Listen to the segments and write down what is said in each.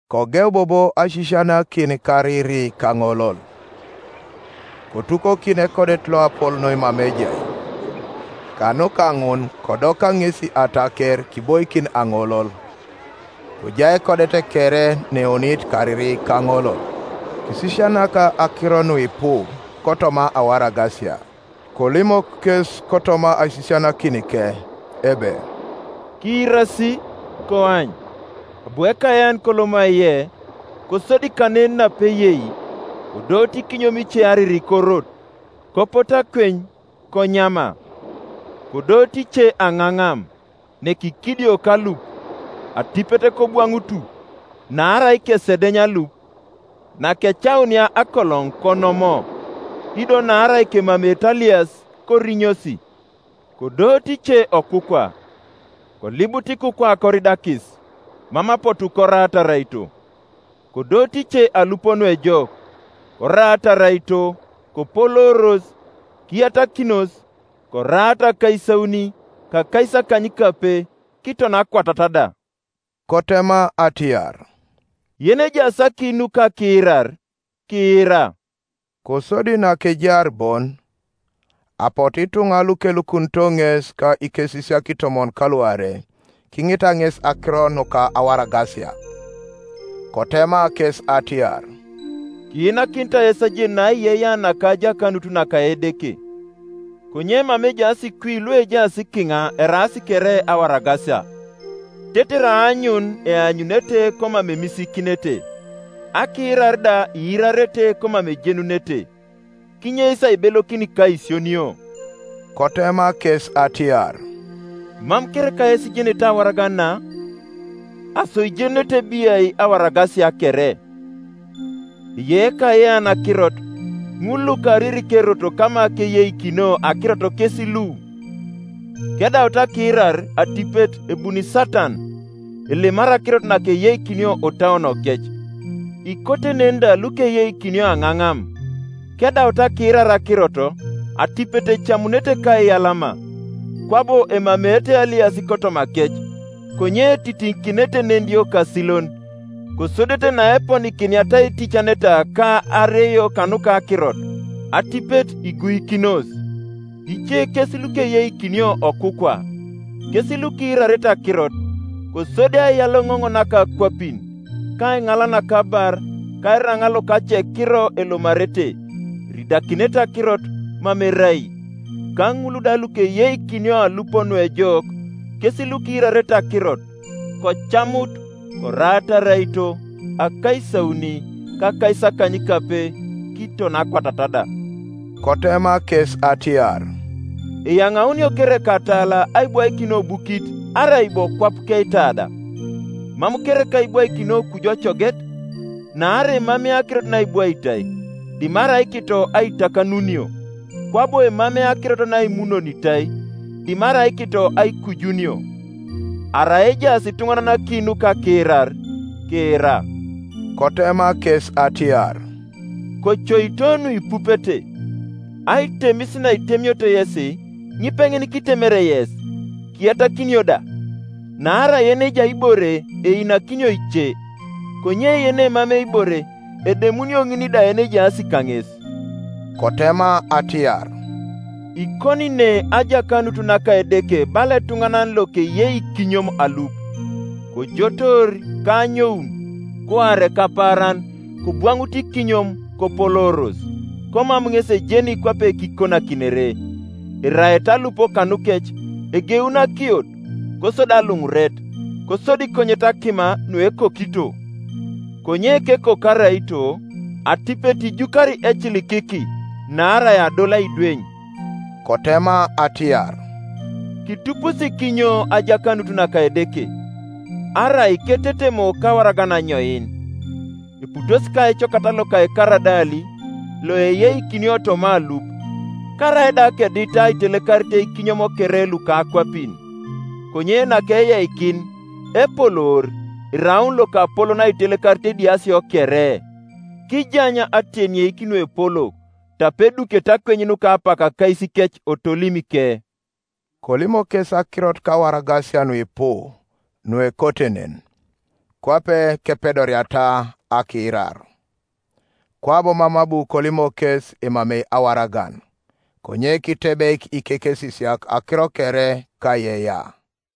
Kogeu bobo aisisianakin kariri kaŋolol. Kotukokin ekodet loapol noi mama ejai, kanuka ŋun kodoka ŋesi ataker kiboikin aŋolol; kojai ekodet kere neeonit kariri kaŋolol. Kisisianak akiro nuipu kotoma awaragasia, kolimok kes kotoma aisisianakinike ebe, “Kiirasi! Koany, abu ekayean koloma aiye. Kosodi kanen napeyei, kodooto ikinyom ice ariri korot, kopotu akweny, konyama. Kodooto ice aŋaŋam, nekikidioko alup; atipet kobwaŋutu, naarai kesedeny alup. Nakecaunia akoloŋ konomo; ido naarai kemameete alias, korinyosi. Kodooto ice okukwa; kolibut ikukwa koridakis, mam apotu koraata araito. Kodooto ice alup nuejok, koraata araito, kopolooros, kiyatakinos; koraata akaisauni, ka akaisakanykape, kiton akwatat da.” Kotema atiar, “Yenejaas aki nuka akiirar, kiira.” Kosodi nakejaar bon, apotu ituŋa lukelukunito ŋes ka ikesisiak itomon kaluarei kiŋita ŋes akiro nuka awaragasia. Kotema kes atiar, “Kiinakinitai yes ajenun aiyeiyea naka ajakanut naka Edeke; konye mama ejaas kwi luejaas kiŋa eraas kere awaragasia: tetere aanyun eanyunete komam emisiikinete; akiirar da iirarete komam ejenunete; kinyeis aibelokin ka aisionio.” Kotema kes atiar, “Mam kereka yes ijenete awaragan na? Aso ijenunete biai awaragasia kere? Eyei ekayean akirot. Ŋul lukariri kerot kama keyeikinio akirot kes lu; kedaut akiirar, atipet ebuni Satan, elemari akirot nakeyeikinio otauonokec. Ikote nen da lukeyeikinio aŋaŋam, kedaut akiirar akirot, atipet ecamunete kaiyalama. Kwabo emameete alias kotomakec, konye etitiŋikinete nediokasilon; kosodete naeponikiniata aiticaneta ka areio kanuka akirot, atipet iguikinos. Ice kes lukeyeikinio okukwa; kes lukiirarete akirot, kosodi aiyaloŋoŋ naka akwapin, ka aiŋal naka abar, ka eraŋa loka acekiro elomarete, eridakinete akirot, mam erai. Ka ŋul da lukeyeikinio alup nuejok kes lukiirarete akirot, kocamut, koraata araito, akaisauni, ka akaisakanykape kiton akwatat da.” Kotema kes atiar, “Eyaŋaunio kereka atala aibwaikin obukit, arai bo kwap keitada? Mam kereka ibwaikinio kuju ocoget? Naarai emamei akirot naibwaitai, dimarai kito aitakanunio; kwabo emamei akirot naimunonitai, dimarai kito aikujunio. Arai ejaas ituŋanan aki nuka akiirar, kiira.” Kotema kes atiar, “Kocoito nuipupete. Aitemis naitemioto yesi, ŋipeŋin kitemere yes, kiyatakinio da. Naarai yenejai ibore einakinio ice; konye yenemamei ibore, edemunio ŋin da yenejaas kaŋes.” Kotema atiar, “Ikoni ne ajakanut naka Edeke bala etuŋanan lokeyei ikinyom alup; kojotoor, ka anyoun, kuare ka paaran; kobwaŋutu ikinyom kopolooros, komam ŋes ejeni kwape kikonakinere. Eraete alup kanukec, egeuni akiot, kosodi aluŋuret, kosodi konyet akima nuekokito. Konye kekoko araito, atipet ijukari ecilikiki, naarai adol aidweny.” Kotema atiar, “Kitupusi kinyo ajakanut naka Edeke, arai ketetemo kawaragan anyoin? Eputos ka ecokat loka ekaradali, loeyeikinio toma alup, karaida kedit aitelekarit ikinyom kere luka akwapin; konye nakeyeikin, epoloor, eraun lokapolon aitelekarit idiasio kere, kijany atenieik nuepolok, tape edukete akweny nuka apak akaisikec otolimike.” Kolimok kes akirot kawaragasia nuipu nuekote nen, kwape kepedoriata akiirar. Kwabo mam abu kolimok kes emamei awaragan: konye kitebeik ikekesisiak akiro kere kaiyeiyea.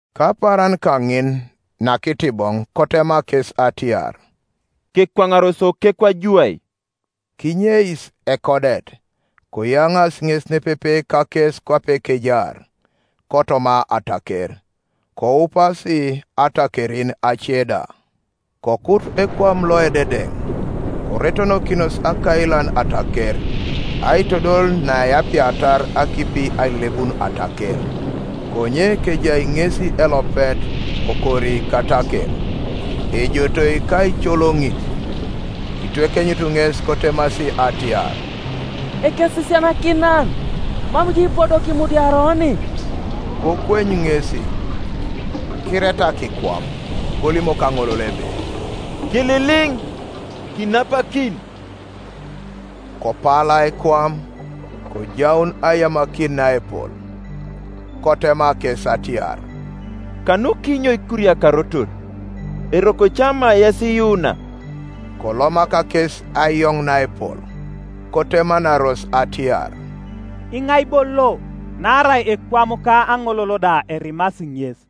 Kapaaran kaŋin, nakitiboŋ, kotema kes atiar, “Kekwaŋaros okekwa juwai.” Kinyeis ekodet, koyaŋaasi ŋes nepepe kakes kwape kejaar, kotoma ataker. Koupasi atakerin ace da. Kokut ekwam loededeŋ, Koretonokinos akailan ataker, aitodol neapiatar akipi ailelebun ataker, Konye kejai ŋesi elopet okori kataker, ejotoi kaicolonit. Kitwekenyut ŋes kotemasi atiar, “Ekesisianakinan, mam jo ipodo kimudiari oni?” Kokweny ŋesi, kiretak ekwam, kolimok aŋolol ebe, “Kililiŋ! Kinapakin!” Kopala ekwam, kojaun aiyamakin naepol. Kotema kes atiar, “Kanukinyo ikuriakarotor? Eroko ca ma yes iyuuna?” Kolomak kes aiyoŋ naepol, kotemanaros atiar, “Iŋai bo lo, naarai ekwam ka aŋolol da erimasi ŋes?”